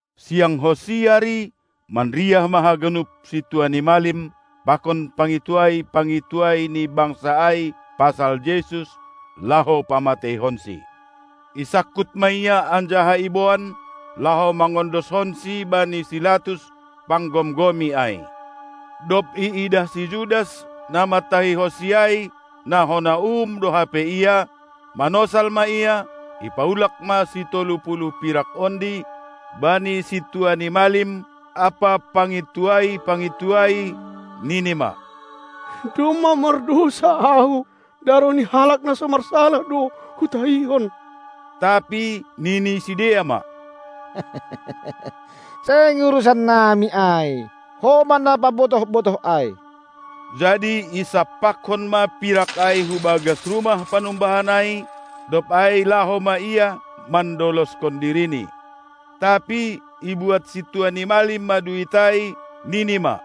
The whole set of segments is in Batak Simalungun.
Siangkonsi ari, manriah ma haganup sintua ni malim pakon pangintuai-pangintuai ni bangsa ai pasal Jesus, laho pamateihonsi. Isangkut ma Ia anjaha iboan, laho mangondoskonSi bani si Latus, panggomgomi ai. Dob iidah si Judas, na mantahihonSi ai, na hona uhum do hape Ia, manosal ma ia, ipaulak ma sitolu puluh pirak ondi bani sintua ni malim ampa pangintuai-pangintuai, nini ma: Domma mardousa ahu, daroh ni Halak na so marsalah do hutahihon! Tapi nini sidea ma: Seng urusannami ai! Ho ma na pabotoh-botoh ai! Jadi isampakkon ma pirak ai hubagas rumah panumbahan ai, dob ai laho ma ia mandoloskon dirini. Tapi ibuat sintua ni malim ma duit ai, nini ma: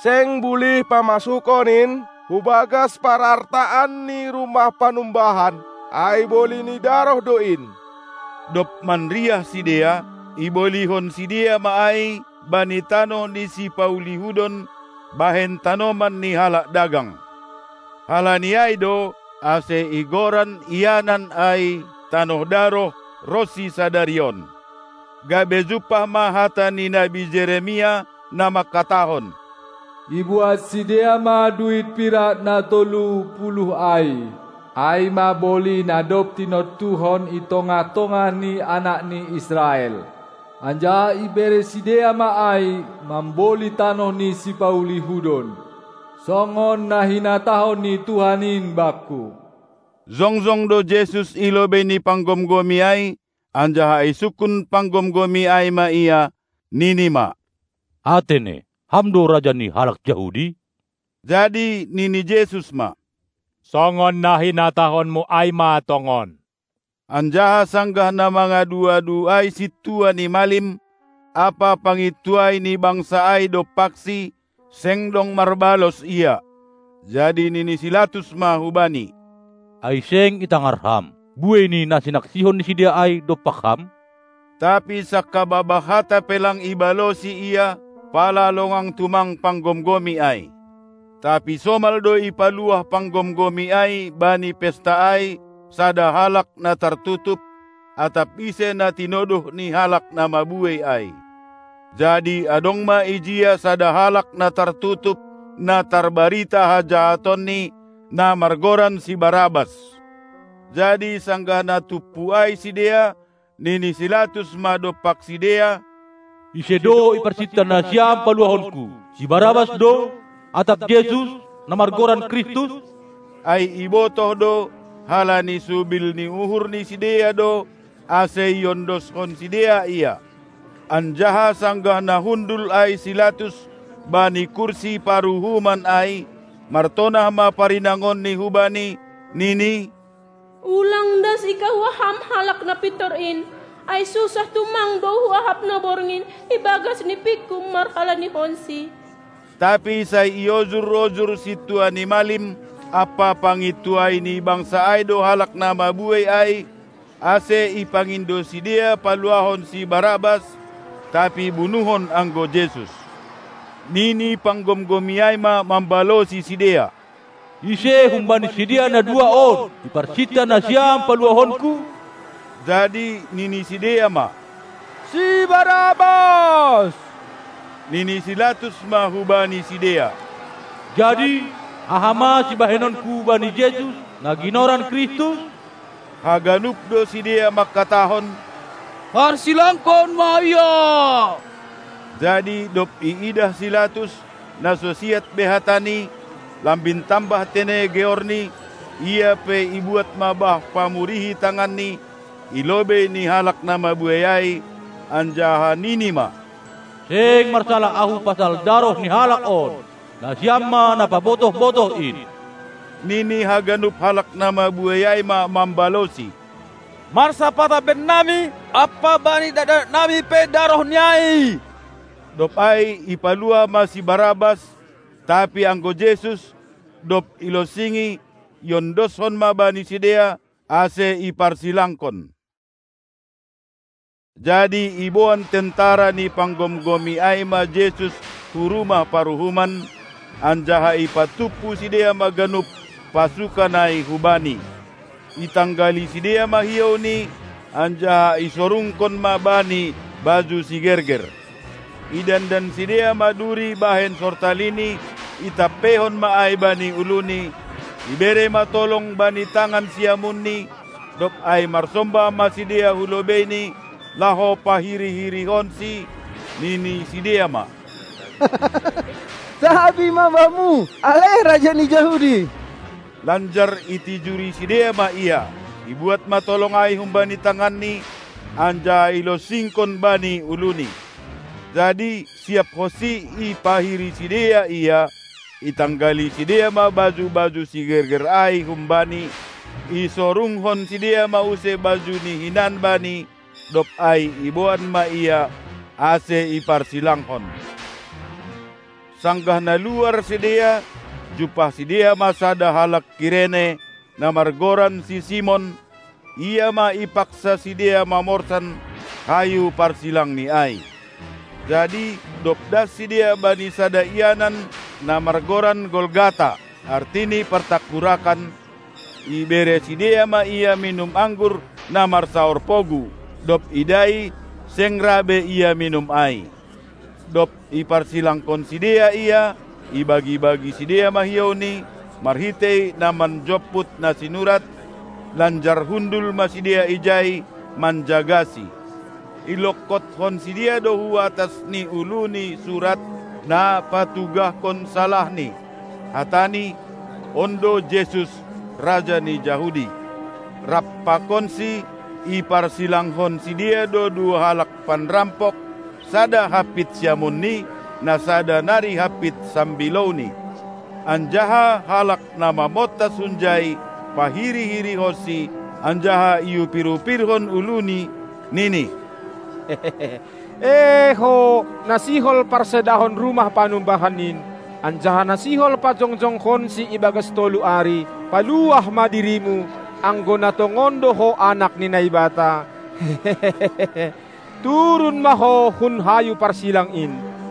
Seng bulih pamasukon in hubagas parartaan ni rumah panumbahan, ai boli ni daroh do in! Dob manriah sidea, ibolihon sidea ma ai bani tanoh ni sipauli hudon bahen tanoman ni halak dagang. Halani ai do, ase igoran ianan ai tanoh daroh ronsi sadari on. Gabe jumpah ma hata ni nabi Jeremia, na mangkatahon: Ibuat sidea ma duit pirak na tolu puluh ai, ai ma boli na dob tinontuhon i tongah-tongah ni anak ni Israel, anjaha ibere sidea ma ai mamboli tanoh ni sipauli hudon, songon na hinatahon ni Tuhan in bakku. Jongjong do Jesus i lobei ni panggomgomi ai, anjaha isungkun panggomgomi ai ma Ia, nini ma: Atene, Ham do raja ni halak Jahudi? Jadi nini Jesus ma: Songon na hinatahonmu ai ma tongon. Anjaha sanggah na mangadu-adu ai sintua ni malim ampa pangintuai ni bangsa ai dompakSi, seng dong marbalos Ia. Jadi nini si Latus ma hu Bani: Ai seng itangar Ham buei ni na sinaksihon ni sidea ai dompak Ham? Tapi sangkababah hata pe lang ibalosi ia, pala longang tumang panggomgomi ai. Tapi somal do ipaluah panggomgomi ai bani pesta ai sada halak na tartutup, atap ise na tinodoh ni halak na mabuei ai. Jadi adong ma ijia sada halak na tartutup na tarbarita hajahatonni, na margoran si Barabas. Jadi sanggah na tumpu ai sidea, nini si Latus ma dompak sidea: Ise do iparsinta nasiam paluahonku, si Barabas do, atap Jesus, na margoran Kristus? Ai ibotoh do, halani subil ni uhur ni sidea do, ase iondoskon sidea Ia. Anjaha sanggah na hundul ai si Latus bani kursi paruhuman ai, martonah ma parinangonni hubani, nini: Ulang das ikahua ham Halak na pintor in, ai susah tumang do huahap na borngin ibagas nipingku marhalanihonSi. Tapi sai iojur-ojur sintua ni malim ampa pangintuai ni bangsa ai do halak na mabuei ai, ase ipangindo sidea paluahon si Barabas, tapi bunuhon anggo Jesus. Nini panggomgomi ai ma mambalosi sidea: Ise humbani sidea na dua on iparsinta nasiam paluahonku? Jadi nini sidea ma: Si Barabas! Nini si Latus ma hubani sidea: Jadi, aha ma sibahenonku bani Jesus, na ginoran Kristus? Haganup do sidea mangkatahon: Parsilangkon ma Ia! Jadi dob iidah si Latus, na so siat be hatani, lambin tambah tene georni, ia pe ibuat ma bah pamurihi tanganni i lobei ni halak na mabuei ai, anjaha nini ma: Seng marsalah ahu pasal daroh ni Halak on! Nasiam ma na pabotoh-botoh in! Nini haganup halak na mabuei ai ma mambalosi: Marsapata bennami ampa bani dakdanaknami pe darohNi ai. Dob ai ipaluah ma si Barabas, tapi anggo Jesus, dob ilonsingi, iondoskon ma bani sidea, ase iparsilangkon. Jadi iboan tentara ni panggomgomi ai ma Jesus hu rumah paruhuman, anjaha ipatumpu sidea ma ganup pasukan ai hu Bani. Itanggali sidea ma hiouNi, anjaha isorungkon ma Bani baju sigerger. Idandan sidea ma duri bahen sortaliNi, itampeihon ma ai bani uluNi; ibere ma tolong bani tangan siamunNi, dob ai marsombah ma sidea hu lobeiNi, laho pahiri-hirihonSi, nini sidea ma: Tabi ma Bamu, ale Raja ni Jahudi! Lanjar itijuri sidea ma Ia, ibuat ma tolong ai humbani tanganNi anjaha ilonsingkon bani uluNi. Jadi siapkonsi ipahiri sidea Ia, itanggali sidea ma baju-baju sigerger ai hum Bani, isorungkon sidea ma use bajuNi hinan bani, dob ai iboan ma Ia, ase iparsilangkon. Sanggah na luar sidea, jumpah sidea ma sada halak Kirene, na margoran si Simon, ia ma ipaksa sidea mamorsan hayu parsilangNi ai. Jadi dob das sidea bani sada ianan, na margoran Golgata (artini partangkurakan), ibere sidea ma Ia minum anggur na marsaor pogu; dob idai, seng ra be Ia minum ai. Dob iparsilangkon sidea Ia, ibagi-bagi sidea ma hiouNi marhitei na manjomput na sinurat; lanjar hundul ma sidea ijai manjagaSi. Ilongkothon sidea do hu atas ni uluni surat, na patugahkon salahNi. Hatani: On do Jesus, Raja ni Jahudi! Rap pakonSi iparsilangkon sidea do dua halak panrampok, sada hampit siamunNi, na sada nari hampit sambilouNi. Anjaha halak na mamontas hunjai pahiri-hirihonSi, anjaha iupir-upirhon uluni, nini: E Ho, na sihol parsedahon rumah panumbahan in, anjaha na sihol pajongjongkonsi ibagas tolu ari! Paluah ma diriMu, anggo na tongon do Ho Anak ni Naibata! Turun ma Ho hun hayu parsilang in!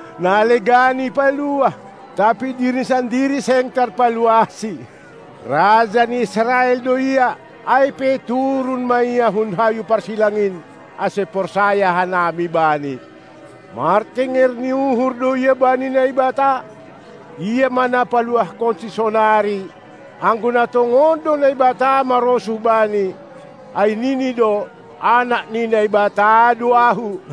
Na legan ipaluah, tapi diriNi sandiri seng tarpaluahSi. Raja ni Israel do Ia, ai pe turun ma Ia hun hayu parsilang in, ase porsaya hanami Bani. Martenger ni uhur do Ia bani Naibata: Ia ma na paluahkonSi sonari, anggo na tongon do Naibata marosuh Bani, ai nini do: Anak ni Naibata do Ahu!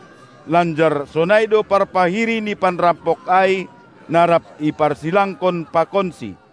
Lanjar sonai do parpahiri ni panrampok ai, na rap iparsilangkon pakonsi.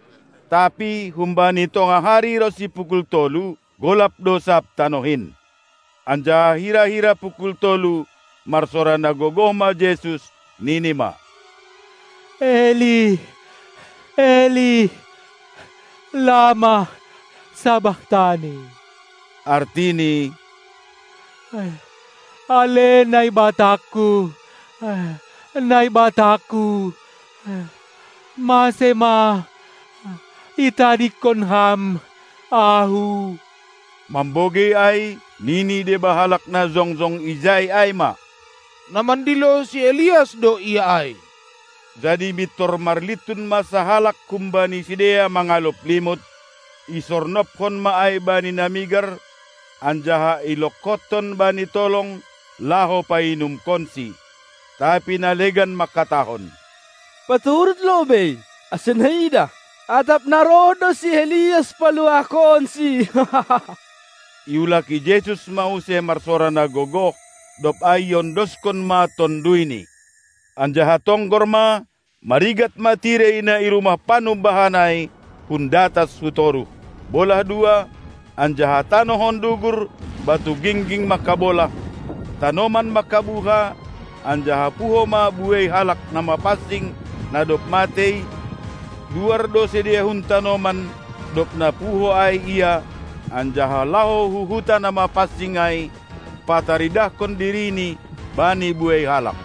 Tapi humbani tongah ari ronsi pukul tolu, golap do sab tanoh in. Anjaha hira-hira pukul tolu marsora na gogoh ma Jesus, nini ma: Eli, Eli, lama sabachtani? Artini: Ale NaibatangKu, NaibatangKu, mase ma itadingkon Ham Ahu? Mambogei ai, nini deba halak na jongjong ijai ai ma: Na mandilo si Elias do Ia ai! Jadi mintor marlintun ma sahalak humbani sidea mangalop limut, isornobkon ma ai bani na migar, anjaha ilongkothon bani tolong laho painumkonSi. Tapi na legan mangkatahon: Paturut lobei, ase naidah, atap na roh do si Elias paluahkonSi. Iulaki Jesus ma use marsora na gogoh, dob ai iondoskon ma ToduyNi. Anjaha tonggor ma, marigat ma tirei na i rumah panumbahan ai hun datas hu toruh, bolah dua, anjaha tanoh on dugur, batu gingging mangkabolah, tanoman mangkabuha, anjaha puho ma buei halak na mapansing, na dob matei, luar do sidea hun tanoman, dob na puho ai Ia, anjaha laho hu huta na mapansing ai pataridahkon dirini bani buei halak.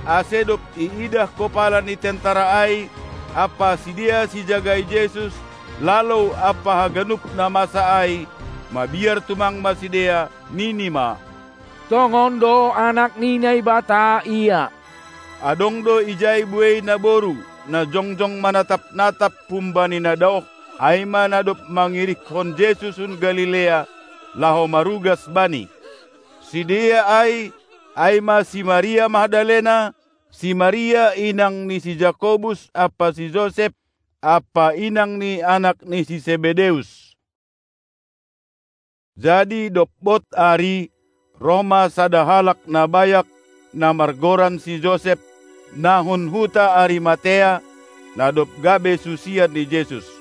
Ase dob iidah kopala ni tentara ai, ampa sidea sijagai Jesus lalou ampa haganup na masa ai, mabiar tumang ma sidea, nini ma: Tongon do Anak ni Naibata Ia! Adong do ijai buei naboru, na jongjong manatap-natap humbani na daoh, ai ma na dob mangirikkon Jesus hun Galilea, laho marugas Bani. Sidea ai, ai ma si Maria Magdalena, si Maria inang ni si Jakobus ampa si Josep, ampa inang ni anak ni si Sebedeus. Jadi dob bod ari, roh ma sada halak na bayak, na margoran si Josep, na hun huta Arimatea, na dob gabe susian ni Jesus.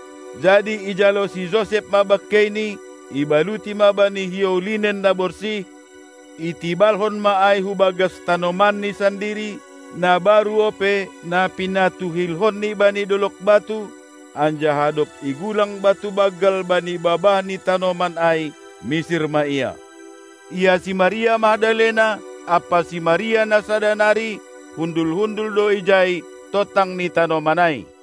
Jadi ijalo si Josep ma bangkeiNi, ibaluti ma bani hiou linnen na borsih; itibalhon ma ai hu bagas tanomanni sandiri, na baru ope, na pinatuhilhonni bani dolog batu, anjaha dob igulang batu banggal bani babah ni tanoman ai misir ma ia. Ia si Maria Magdalena ampa si Maria na sada nari, hundul-hundul do ijai, tontang ni tanoman ai.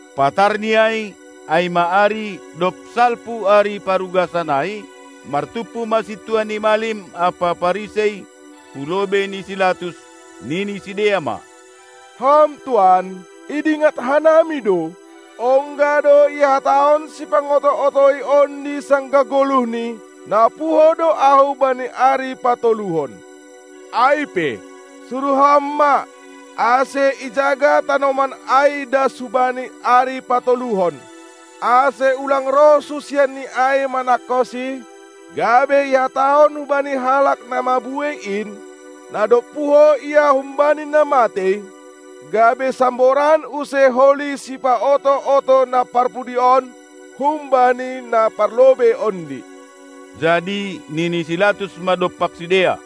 Patarni ai, ai ma ari, dob salpu ari parugasan ai, martumpu ma sintua ni malim ampa Parisei hulobei ni si Latus, nini sidea ma: Ham tuan, idingat hanami do, ongga do ihatahon sipangoto-otoi ondi sanggah goluhni: Na puho do Ahu bani ari patoluhon! Ai pe, suruh ham ma, ase ijaga tanoman ai das hubani ari patoluhon, ase ulang roh susianni ai manangkonsi, gabe ihatahon hubani halak na mabuei in, na dob puho Ia humbani na matei, gabe samboran use holi sipaoto-oto na parpudi on humbani na parlobei ondi. Jadi nini si Latus ma dompak sidea: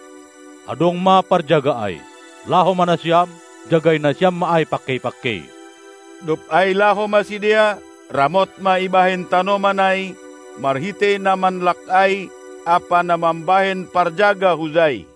Adong ma parjaga ai! Laho ma nasiam, jagai nasiam ma ai pangkei-pangkei! Dob ai laho ma sidea, ramot ma ibahen tanoman ai marhitei na manlak ai ampa na mambahen parjaga hujai.